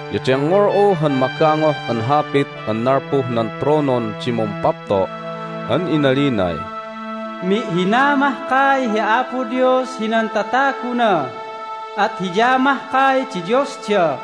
Ya dengngol'u han magangoh an hapit an nalpuh nan tronon di Mumpapto' an inalinay, "Mi'hina mahkay hi Apo Dios hinan tataguna. At Hiya mahkay di Diosda.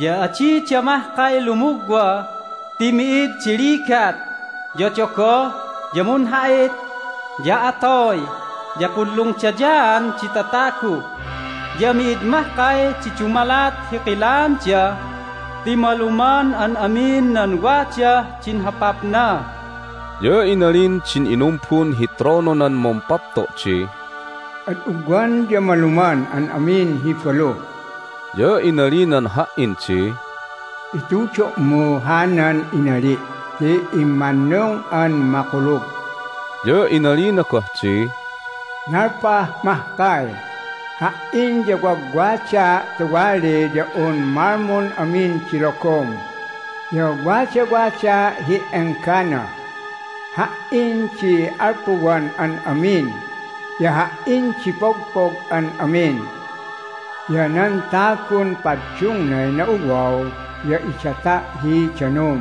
Ya adida mahkay lumugwa ti mi'id di ligat, ya dogoh, ya munha'it, ya atoy, ya punlungdayaan di tatagu, ya mi'id mahkay di dumalat hi kilaanda ti maluman an amin nan wadah din hopapna." Ya inalin din inumbun hi trononan Mumpapto' di, "Ad ugwan ya maluman an amin hi balu!" Ya inalinan ha"in di, "Itudo'mu hanan inali' ti immannung an makulug." Ya inalina goh di, "Nalpah mahkay! Ha"in ya wagwadaa' tuwali ya un malmun amin di logom, ya wadawadaa' hi enggana. Ha"in di alpuwan an amin, ya Ha"in di pogpog an amin. Ya nan tagun paddungnay na'uwaw ya idata' hi danum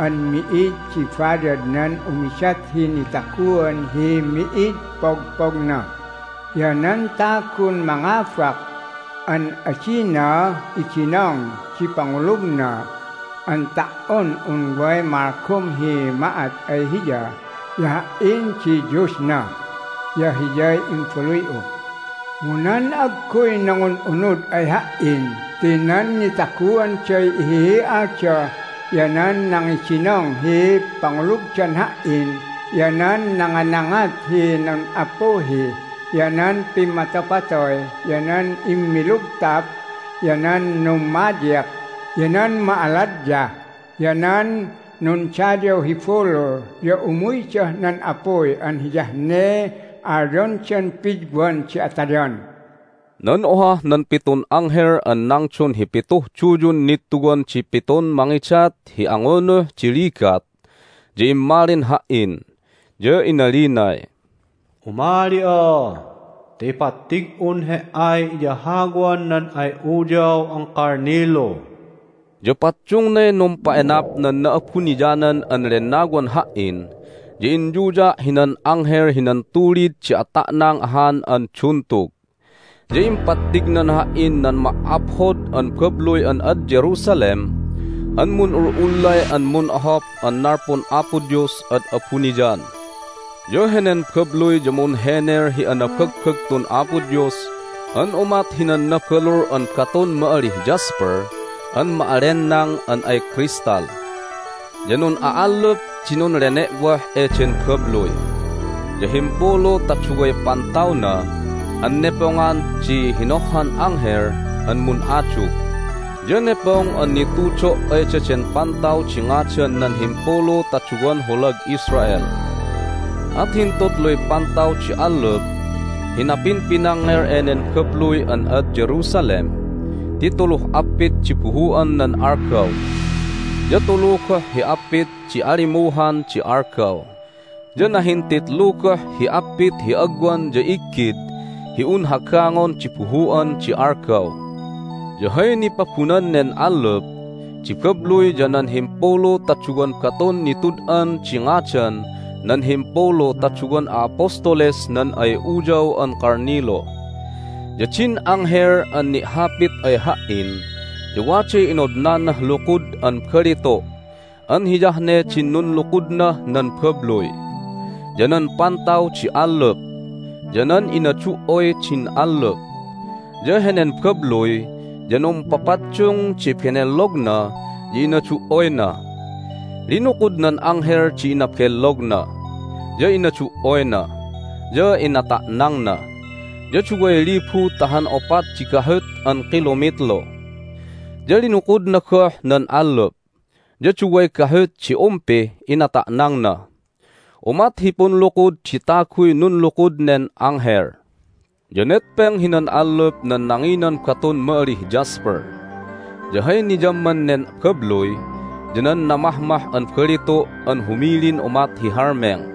an mi'id di bayadnan umidat hi nitaguan hi mi'id pogpogna. Ya nan tagun mangabak an adina idinong di pangulugna an ta"on un way malgom hi ma'at ay hiya ya Ha"in di Diosna, ya hiyay imbaluy'u. Mu nan agguy nangun'unud ay Ha"in ti nan nitaguanday ihihi'alda, ya nan nangidinong hi pangulugdan Ha"in, ya nan nanganangat hi nun'appuhi, ya nan pimmatopatoy, ya nan immilugtap, ya nan nummadyik, ya nan ma'aladyah, ya nan nundayaw hi bulul ya umuydah nan apuy an hiyah ne alyondan pidwan di atayan." Nan ohah nan pitun anghel an nangdon hi pituh duyun nittuwan di pitun mangidat hi angunuh di ligat ya immalin ha"in, ya inalinay, "Umali'a ta ipattig'un he"ay iyahawan nan ay Uyaw an Kalnilu." Ya paddungnay numpa'enap nan Na'abuniyanan an Lennawan ha"in, ya inyuya' hinan anghel hinan tulid di ata'nang ahan an duntug, ya impattignan ha"in nan ma"aphod an babluy an ad Jerusalem an mun'ul'ullay an mun'ohop an nalpun Apo Dios ad abuniyan. Ya henen babluy ya munhenel hi anabagbagtun Apo Dios an umat hinan nabalul an batun ma'alih jasper an ma'allenang an ay crystal. Ya nun'a'allup di nunlene'woh eden babluy, ya himpulu ta duway pantawna an nepongan di hinohhan anghel an mun'adug. Ya nepong an nitudo' ay daden pantaw di ngadan nan himpulu ta duwan holag Israel. At hintutluy pantaw di allup hi napinpinangngel enen babluy an ad Jerusalem ti tuluh appit di buhu'an nan algaw, ya tulu goh hi appit di alimuhan di algaw, ya nahintitlu goh hi appit hi agwan ya iggid hi un hagangon di buhu'an di algaw. Ya hay nipabunan nen allup di babluy ya nan himpulu ta duwan batun nitud'an di ngadan nan himpulu ta duwan a'apostoles nan ay Uyaw an Kalnilu. Ya din anghel an ni'hapit ay ha"in ya waday inodnanah lukud an balitu' an hiyah ne din nunlukudnah nan babluy, ya nan pantaw di allup, ya nan inadu"oy din allup. Ya henen babluy ya numpapaddung di benellogna ya inadu"oyna. Linukud nan anghel di inabellogna, ya inadu"oyna, ya inata'nangna, ya duway libu ta han opat di gahut an kilomitlu. Ya linukudna goh nan allup, ya duway gahut di umpih inata'nangna. Umat hi punlukud di taguy nunlukud nen anghel. Ya netpeng hinan allup nan nanginan batun ma'alih jasper. Ya hay niyamman nen babluy ya nan namahmah an balitu' an humilin umat hi halmeng.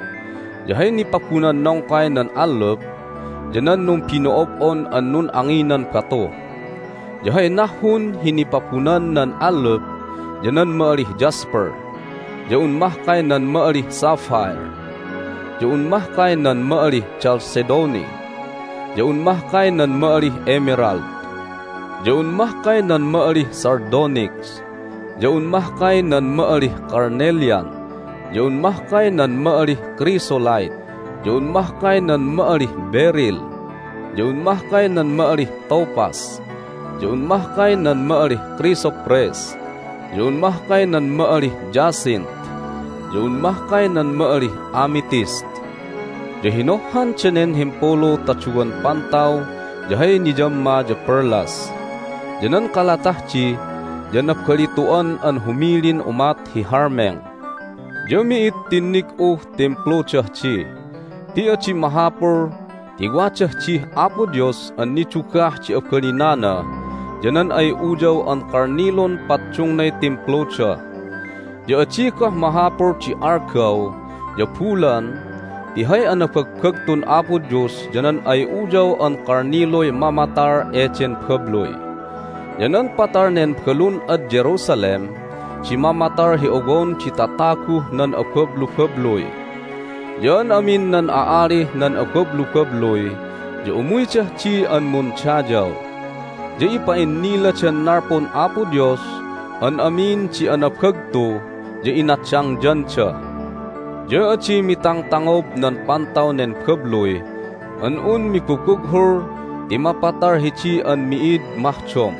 Ya hay nipabunan nongkay nan allup ya nan numbino'ob'on an nun'anginan batu. Ya hay nahhun hi nipabunan nan allup ya nan ma'alih jasper, ya un mahkay nan ma'alih sapphire, ya un mahkay nan ma'alih chalcedony, ya un mahkay nan ma'alih emerald, ya un mahkay nan ma'alih sardonyx, ya un mahkay nan ma'alih carnelian, ya un mahkay nan ma'alih chrysolite, ya un mahkay nan ma'alih beryl, ya un mahkay nan ma'alih topaz, ya un mahkay nan ma'alih chrysoprase, ya un mahkay nan ma'alih jacinth, ya un mahkay nan ma'alih amethyst. Ya hinohhan danen himpulu ta duwan pantaw ya hay niyamma ya perlas. Ya nan kalatah di ya nabalitu'an an humilin umat hi halmeng. Ya mi'id tinnig'uh Timpludah di ti adi mahapul ti wadah dih Apo Dios an nidugah di abalinana ya nan ay Uyaw an Kalnilun paddungnay Timpluda. Ya adi goh mahapul di algaw ya bulan ti hay anabagbagtun Apo Dios ya nan ay Uyaw an Kalniluy mamatal eden babluy. Ya nan patal nen balun ad Jerusalem di mamatal hi owon di tataguh nan abablubabluy. Ya an amin nan a'alih nan abablubabluy ya umuydah di an mundayaw, ya ipa'inniladan nalpun Apo Dios an amin di anabagtu ya inadangyanda. Ya adi mitangtangob nan pantaw nen babluy an un mibubughul ti mapatal hidi an mi'id mahdom.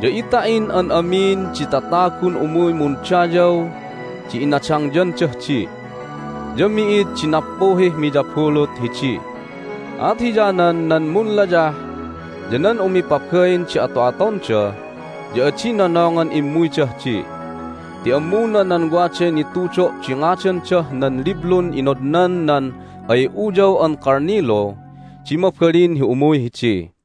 Ya ita'in an amin di tatagun umuy mundayaw di inadangyandah di. Ya mi'id di nappuhih miyabulut hidi, at hiyanan nan munlayah ya nan umipabain di ato'atonda ya adi nonongan immuydah di. Ti ammuna nan waday nitudo' di ngadandah nan liblun inodnan nan ay Uyaw an Kalnilu di mabalin hi umuy hidi.